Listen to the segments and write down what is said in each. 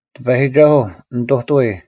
ᑎᐸᔨᒋᒐᓱᐤ, ᓂᑐᑐᐎ: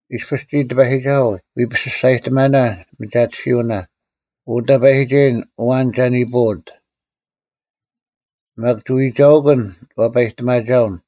ᐃᔅᐱᔅ ᒋᔾ, ᑎᐸᔨᒋᒐᓱᐤ, ᐎ ᐱᓯᔅᒐᔨᑎᒥᓇ ᒥᒐᑎᓯᐅᓇ, ᐅ ᑕᐸᔨᒋᒐᔨᓐ, ᐊᐛᓐ ᒐ ᓂᐳᐅᑦ? ᒪᒃ ᒋ ᐎᒐᐅᑯᓐ ᐛᐸᔨᑎᒪᒐᐅᓐ,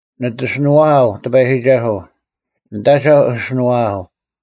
ᓂᑦ ᐊᓯᓄᐛᐊᐤ ᑎᐸᔨᒋᒐᓱᐤ, ᓂᑦ ᐊᒐᐧᒄ ᐊᓯᓄᐛᐊᐤ,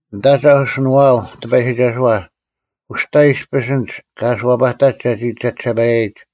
ᓂᑦ ᐊᒐᐧᒄ ᐊᓯᓄᐛᐊᐤ ᑎᐸᔨᒋᒐᓱᐛ, ᐅᔅᑕ ᐃᔅᐱᔅ ᐊᓐᒡ ᑲ ᐊᓱᐛᐸᑕᒡ ᒐᒋ ᒐᒋᓴᐸᔭᔨᒡ: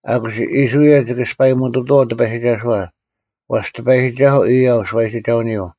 ᐊᑯᔅ ᐃᔅᕋᐃᓪ ᒋᑭ ᐊᔅᐸᔨᒧᑐᑐᐛᐤ ᑎᐸᔨᒋᒐᓱᐛ: ᐛᔅ ᑎᐸᔨᒋᒐᓱᐤ ᐊᔭᐤ ᓱᐛᔨᒋᒐᐅᓂᔪᐤ,